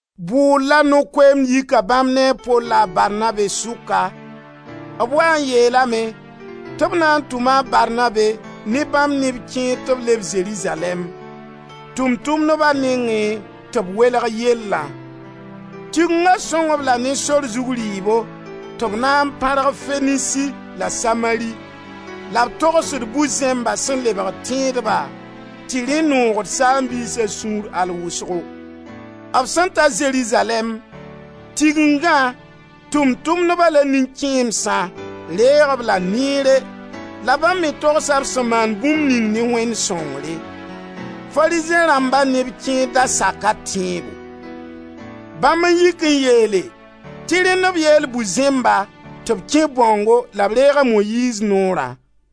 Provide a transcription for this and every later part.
Bʋʋr la no-koeemd yika bãmb ne a Pol la a Barnabe sʋka. B waa n yeelame tɩ b na n tʋma a Barnabe ne bãmb neb kẽer tɩ b leb Zerizalɛɛm, Tʋʋm-tʋmdba nengẽ tɩ b welg yellã. Tigenga sõng-b la ne sor zug rɩɩbo tɩ b na n pãrg Fenisi la Samari, la b togsd bu-zẽmba sẽn lebg tẽedba tɩ rẽ noogd saam-biisa sũur al wʋsgo. B sẽn ta Zerizalɛɛm, Tigengã, Tʋʋm-tʋmdba la nin-kẽemsã, reeg-b la neere la bãmb me togsa b sẽn maan bũmb ning ne Wẽnd sõngre. Farizẽ rãmba neb kẽer da saka tẽebo. Bãmb n yik n yeele tɩ rẽnd b yeel bu-zẽmba tɩ b kẽ bãongo la b reeg a Moyiiz Noorã.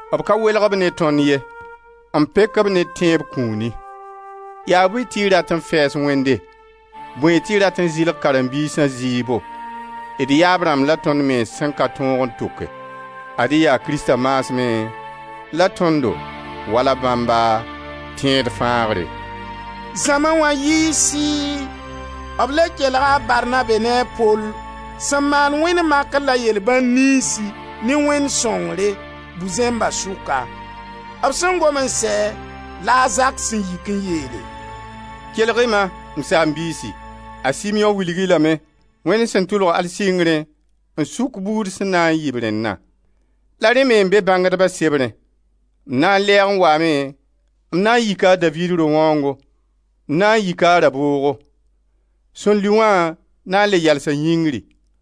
B ka welg-b ne tõnd ye, n pek-b ne tẽeb kũuni. Yaa bõe tɩ y rat n fɛɛs Wẽnde, bõe tɩ y rat n zɩlg karen-biisã zɩɩbo, d yaab rãmb la tõnd mens sẽn ka tõog n tʋke? Ad-y yaa Krista maasmẽ la tõndo, wala bãmba, tẽed fãagre.» Zãma wã yɩɩ sɩɩ. B le kelga a Barnabe ne a Pol sẽn maan wẽnd makr la yel-bãn niynsi ne Wẽnd sõngre, bu-zẽmba sʋka. B sẽn gom n sɛ la a Zak sẽn yik n yeele: «Kelg-y ma, m saam-biisi; a Simeõ wilg-y lame Wẽnd sẽn tʋlg al sɩngrẽ n sʋk buud sẽn na yɩ b rẽnna. ‹La rẽ me n be bãngdba sebrẽ: M na n lɛɛg n waame m na n yika a Daviid ro-wãoongo m na n yika a raboogo; sẽn lʋɩ wã na n le yalsa yĩngri,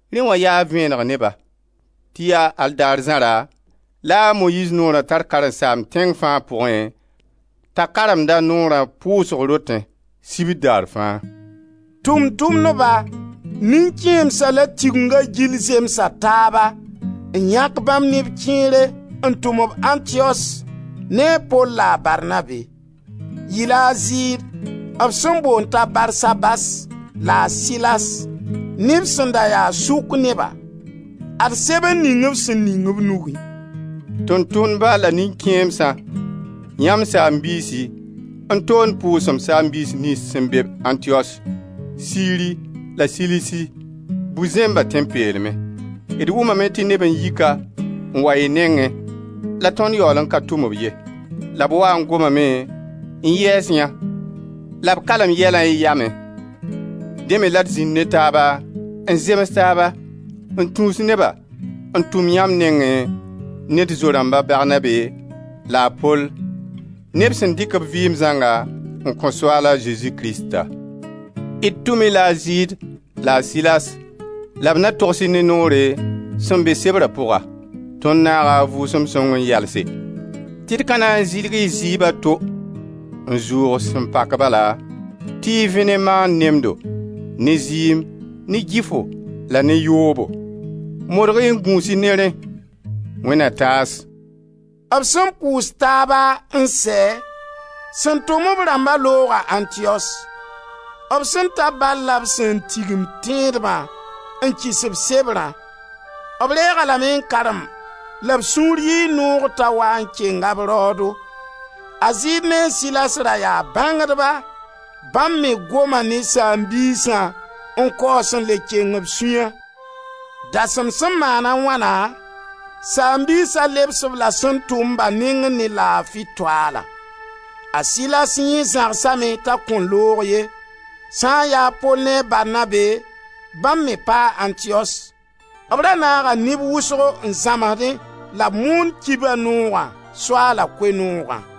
Rẽ wã yaa vẽeneg ne ba tɩ yaa al daar zãra la a Moyiiz Noora tar karen-saamb tẽng fãa pʋgẽ t'a karemd-a noora pʋʋsg rotẽ, sibr daar fãa.» Tʋʋm-tʋmdba, nin-kẽemsã la Tigenga gill zemsa taaba n yãk bãmb neb kẽere n tum-b Antiyos ne a Pol la a Barnabe. Yɩ-la a Zɩɩd, b sẽn boond t'a Barsabas la a Silas, neb sẽn da ya sʋk neba. Ad sebr ning b sẽn ning b nugẽ: «Tʋʋm-tʋmdba la nin-kẽemsã, yãmb saam-biisi, n toond pʋʋsem saam-biis niyns sẽn be-b Antiyos, Siri la Silisi, bu-zẽmba tẽn-peelmẽ. D wʋmame tɩ neb n yi ka n wa y nengẽ la tõnd yaool n ka tʋm-b ye, la b waa n gomame n yɛɛs yã la b kalem yɛlã y yamẽ. Dẽ me la d zĩnd ne taaba n zems taaba n tũus neba n tʋm-b yãmb nengẽ ne d zo-rãmb a Barnabe la a Pol, neb sẽn dɩk b vɩɩm zãnga n kõ Soaala Zezi Krista. D tʋm-y-la a Zɩɩd la a Silas la b na togs-y ne noore sẽn be sebra pʋga. Tõnd naaga a Vʋʋsem Sõng n yalse tɩ d ka na n zɩlg-y zɩɩb a to n zʋʋg sẽn pak bala tɩ y vẽ ne maand nemdo, ne zɩɩm, ne gɩfo la ne yoobo. Modg-y n gũus-y ne rẽ. Wẽnd na taas!» B sẽn pʋʋs taaba n sɛ, sẽn tʋm b rãmba looga Antiyos. B sẽn ta bal la b sẽn tigim tẽedbã n kɩs-b sebrã. B reeg-a lame n karem la b sũur yɩɩ noog t'a waa n kenga b raoodo. A Zɩɩd ne a Silas ra yaa bãngdba, bãmb me goma ne saam-biisã n kaoos n le keng b sũya. Dasem sẽn maan a wãna, saam-biisa lebs-b la sẽn tʋm-ba nengẽ ne laafi toaala. [ A Silas yẽ zãgsame t'a kõn loog ye.] Sã n ya a Pol ne a Barnabe, bãmb me paa Antiyos. B ra naaga neb wʋsgo n zãmsdẽ la b moon kiba-noogã, Soaala Koe-noogã.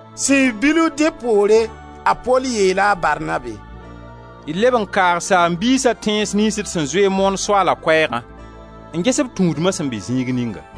Sẽn yɩ bilf dẽ poore, a Pol yeela a Barnabe: «D leb n kaag saam-biisã tẽns niyns d sẽn zoe n moon Soaala koɛɛgã n ges b tũudma sẽn be zĩig ninga.»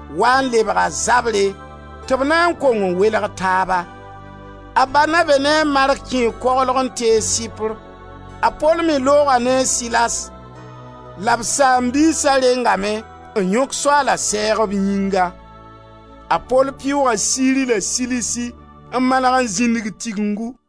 Waa n lebga zabre, tɩ b na n kong n welg taaba. A Barnabe ne a Mark kẽe koglg n tees Sɩpr. A Pol me looga ne a Silas la b saam-biisa rengame n yõk Soaala sɛɛg b yĩnga. A Pol pɩʋʋga Siri la Silisi, n maneg n zĩndig Tigengu.